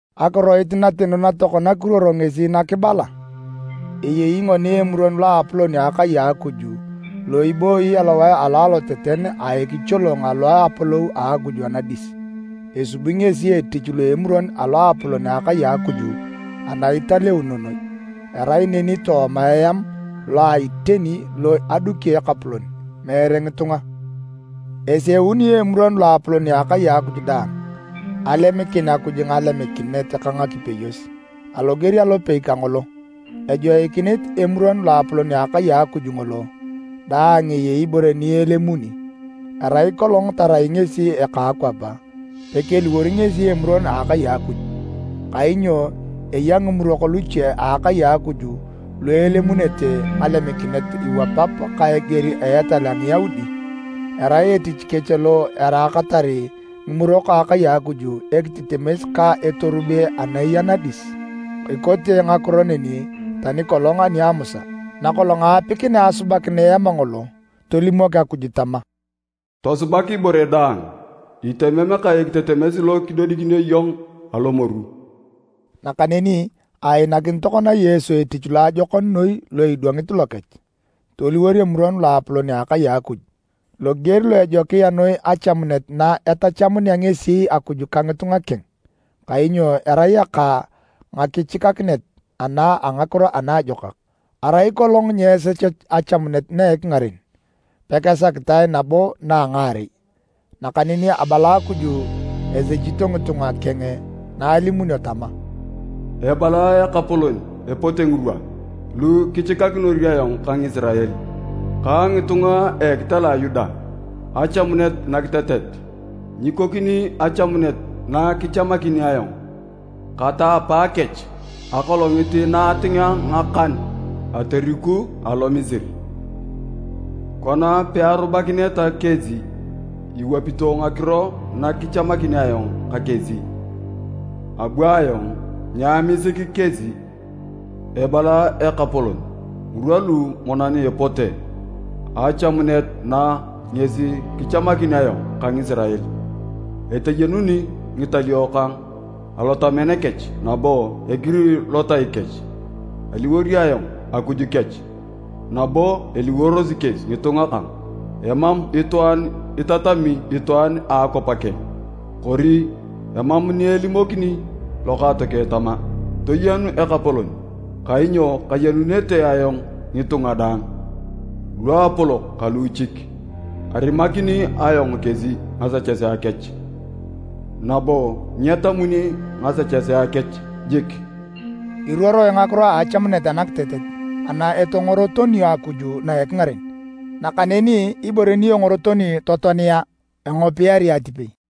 Akiroit nateno na tokona kiruoro ngesi na kibala, eyei ngoni Emuron Loapolon a akai a Akuj lo ibooyi alowae alo aloteten a ekicholong alo a apolou a Akuj anadis. Esubi ngesi etich lo Emuron a Loapolon a akai a Akuj ani Italeuno Noi, erai neni tooma eam lo a iteni lo aduki Ekapolon, meere ngitunga. Eseunio Emuron Loapolon a Akai Akuj daang alemikin Akuj ngalemikinet ka ngakipeyos. Aloger alopei kangolo, ejoikinit Emuron Loapolon a akai a Akuj ngolo dang eyei ibore ni elemuni. Arai kolong tarai ngesi eka akwap, pekeliworo ngesi emuron a akai a Akuj, kainyo eya ngimurok luche a akai a Akuj lu elemuunete ngalemikinet iwapap ka eger a etal a Ngiyaudi. Erai etich kech lo eraakatar ngimurok a akai a Akuj ekitetemes ka etorube ana eya nadis. Ekote ngakiro neni tani kolong ani a Musa. Nakolong aapikinea asubakin Eam ngolo, tolimok Akuj tama, “Tosubak ibore daang itemem ka ekitetemes lo kidodikinio iyong alomoru.” Nakaneni ainakin tokona Yesu etich loajokon noi lo idwangit lokech, toliwor Emuron Loapolon a akai a Akuj, loger lo ejokia noi achamunet na etachamunea ngesi Akuj ka ngitunga keng, kainyo erai aka ngakichikakinet ana a ngakiro anaajokak. Arai kolong nyeesechech achamunet na a ekingaren, pakesakitae nabo na a ngaarei. Nakaneni abala Akuj esechito ngitunga keng na alimunio tama, “Ebala Ekapolon epote ngirwa lu kichikakinor ayong ka Ngisirael, ka ngitunga a ekitela a Yuda, achamunet nakitetet. Nyikokini achamunet na kichamakin ayong kata apaakech akolongit na atingea ngakan atoriku alo Misiri. Kona pearubakineta kesi iwapito ngakiro na kichamakin ayong ka kesi, abu ayong nyaamisik kesi. Ebala Ekapolon, ngirwa lu monan epote, achamunet na ngesi kichamakin ayong ka Ngisirael. Eteyenuni ngitalio kang alotamen kech, nabo egiri lotai kech. Aliwor ayong Akuj kech, nabo eliworosi kesi ngitunga kang. Emam itwaan itatami itwaan a akwap keng, kori emam ni elimokini lokaatokeng tama, ‘Toyenu Ekapolon.’ Kainyo kayenunete ayong ngitunga daang, luapolok ka luuchik. Arimakini ayong kesi ngasechesea kech, nabo nyetamuni ngasechesea kech jik.” Iruoroe ngakiro a achamunet anakitetet ani etongorotonio Akuj na a ekingaren, nakaneni ibore ni engorotoni totoania, engopiari atipei.